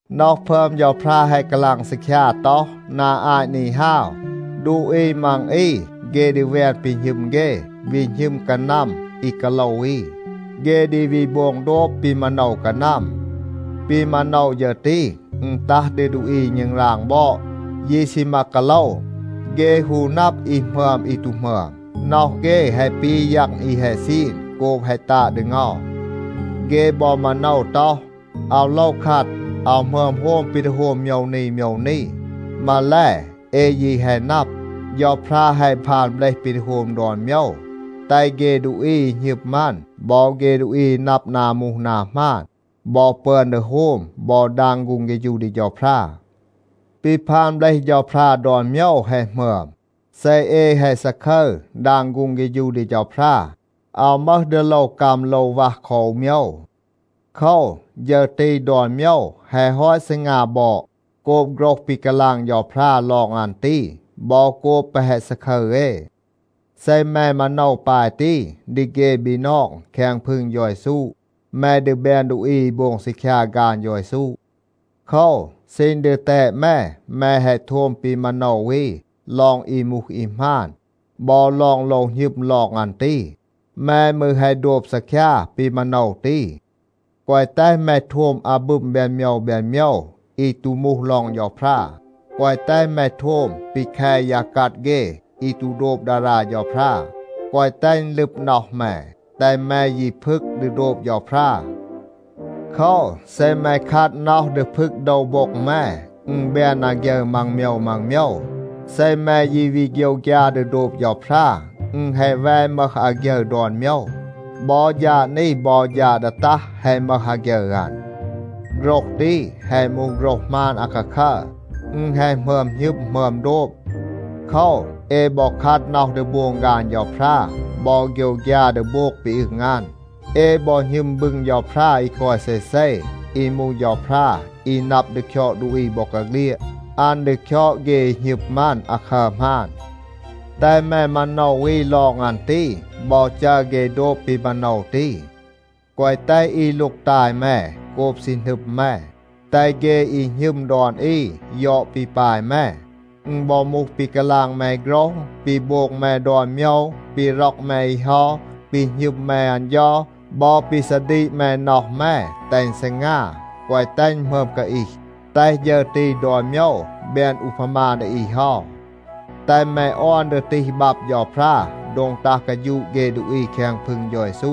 น็อห พึอม เฌาพรา แฮะ กาลาง ซีคยา ต็อห, นา อาต นี ฮาว, ดูอี มัง อี เฆ ดี แวน ปี หณึม เฆ, วี หณึม กานัม อี กาโลว อี. เฆ ดี วี โบง โดบ ปี มาโนว กานัม. ปี มาโนว ฌึร ตี, อึณ ตัห ดี ดูอี อี ณึงราง บอด, ยี ซีมา กาโลว. เฆ ฮู นับ อี หมึอม อี ตู หมึอม. น็อห เฆ แฮะ ปี ยัง อี แฮะ ซีน โกบ แฮะ ตาด ดี เงา. เฆ บอ มาโนว ต็อห, “อาว โลว คัด. อาว หมึอม โฮม ปี ดี โฮม โมยว นี โมยว นี.” มาแล, เอ ยี แฮะ นับ, เฌาพรา แฮะ พาน เบลห ปี ดี โฮม ดอน โมยว, แตห เฆ ดูอี อี หณึม อัน บอ เฆ ดูอี อี นับ นา มูห นา หมาน บอ ปึอน ดี โฮม บอ ดาง ฆูง เฆฌู ดี เฌาพรา. ปี พาน เบลห เฌาพรา ดอน โมยว แฮะ หมึอม. เซ เอ แฮะ ซาคึร ดาง ฆูง เฆฌู ดี เฌาพรา, อาว มึห ดี โลว กัม โลว วัห คอ อู โมยว. โคว, ฌึร ตี ดอน โมยว แฮะ ฮอต ซีงา บอด โกบ โฆรห ปี กาลาง เฌาพรา ลอง อัน ตี บอ โกบ แปะ แฮะ ซาคึร เอ. เซ แม มาโนว ปาย ตี ดี เฆ บีนอง แคง พึง เฌา เยซู, แม ดี แบน ดูอี อี โบง ซีคยา ฆาน เฌา เยซู. โคว, ซีณ ดีแตด แม, แม แฮะ โทม ปี มาโนว อี ลอง อี มูห อี หมาน บอ ลอง โลว หณึม ลอง อัน ตี. แม มืร แฮะ โดบ ซีคยา ปี มาโนว ตี. แกวะ แตห แม โทม อาบึม แบน โมยว แบน โมยว อี ตู มูห ลอง เฌาพรา. แกวะ แตห แม โทม ปี แค ยา กัด เฆ อี ตู โดบ ดารา เฌาพรา, แกวะ แตห อึณ ลึบ น็อห แม. แตห แม ยี พึก ดี โดบ เฌาพรา. โคว, เซ แม คัด น็อห ดี พึก โดว โบ็ง แม, อึณ แบน อาฆยึร มัง โมยว มัง โมยว. เซ แม ยี วี โฆยวฆยา ดี โดบ เฌาพรา, อึณ แฮะ แว มึห อาฆยึร ดอน โมยว. บอ ฌาด นี บอ ฌาด ดี ตัห แฮะ มึห อาฆยึร อัน. โฆรห ตี แฮะ มูห โฆรห หมาน อาคาคัร. อึณ แฮะ หมึอม หณึม หมึอม โดบ. โคว, เอ บอ คัด น็อห ดี โบง ฆาน เฌาพรา บอ โฆยวฆยา ดี โบง ปี อึง อัน. เอ บอ หณึม บึง เฌาพรา อี กอย เซเซ, อี มูห เฌาพรา อี นับ ดี คยอด ดูอี บอกาเฆลียด. อัน ดี คยอด เฆ อี หณึม อัน อาคัร หมาน. แตห แม มาโนว อี ลอง อัน ตี บอ จัร เฆ โดบ ปี มาโนว ตี. แกวะ แตห อี ลูกตาย แม โกบ ซี หนึม แม. แตห เฆ อี หณึม ดอน อี ยอด ปี ปาย แม. อึณ บอ มูห ปี กาลาง แม โฆรห, ปี โบง แม ดอน โมยว, ปี ร็อก แม อี เฮา, ปี หณึม แม อัน เฌา บอ ปี ซาดีก แม น็อห แม, แตห อึณ ซีงา, แกวะ แตห อึณ หมึอม กาอีห, แตห ฌึร ตี ดอน โมยว แบน อูพามา ดี อี เฮา. แตห แม ออน ดี ตีห บับ เฌาพรา โดง ตัห กาฌูะ เฆ ดูอี แคง พึง เฌา เยซู.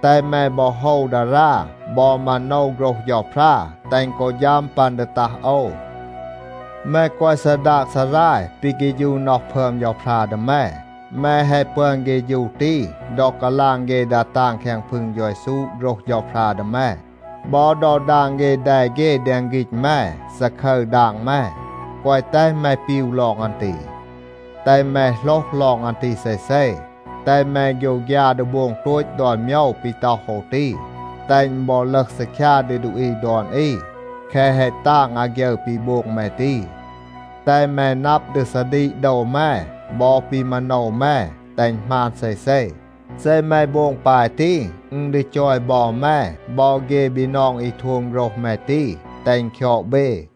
แตห แม บอ โฮว ดารา บอ มาโนว โฆรห เฌาพรา, แตห อึณ กอ ฌัม ปัน ดี ตัห โอว. แม แกวะ ซาดาก ซาราย ปี เฆฌู น็อห พึอม เฌาพรา ดี แม. แม แฮะ ปึอน เฆฌู ตี ดอ กาลาง เฆ ดา ตาง แคง พึง เฌา เยซู โฆรห เฌาพรา ดี แม, บอ ดอ ดาง เฆ แด เฆ แดง ฆีณ แม, ซาคึร ดาง แม. แกวะ แตห แม ปีว ลอง อัน ตี. แตห แม โหลห ลอง อัน ตี เซเซ. แตห แม โฆยวฆยา ดี โบง โตต ดอน โมยว ปี ต็อห โอว ตี, แตห อึณ บอ ลึห ซีคยา ดี ดูอี ดอน อี, แคะ แฮะ ตาง อาฆยึร ปี โบง แม ตี. แตห แม นับ ดี ซาดีก โดว แม บอ ปี มาโนว แม, แตห อึณ หมาน เซเซ. เซ แม โบง ปาย ตี, อึณ ดี จอย บอ แม บอ เฆ บีนอง อี โทม โฆรห แม ตี, แตห อึณ คยอด เบ.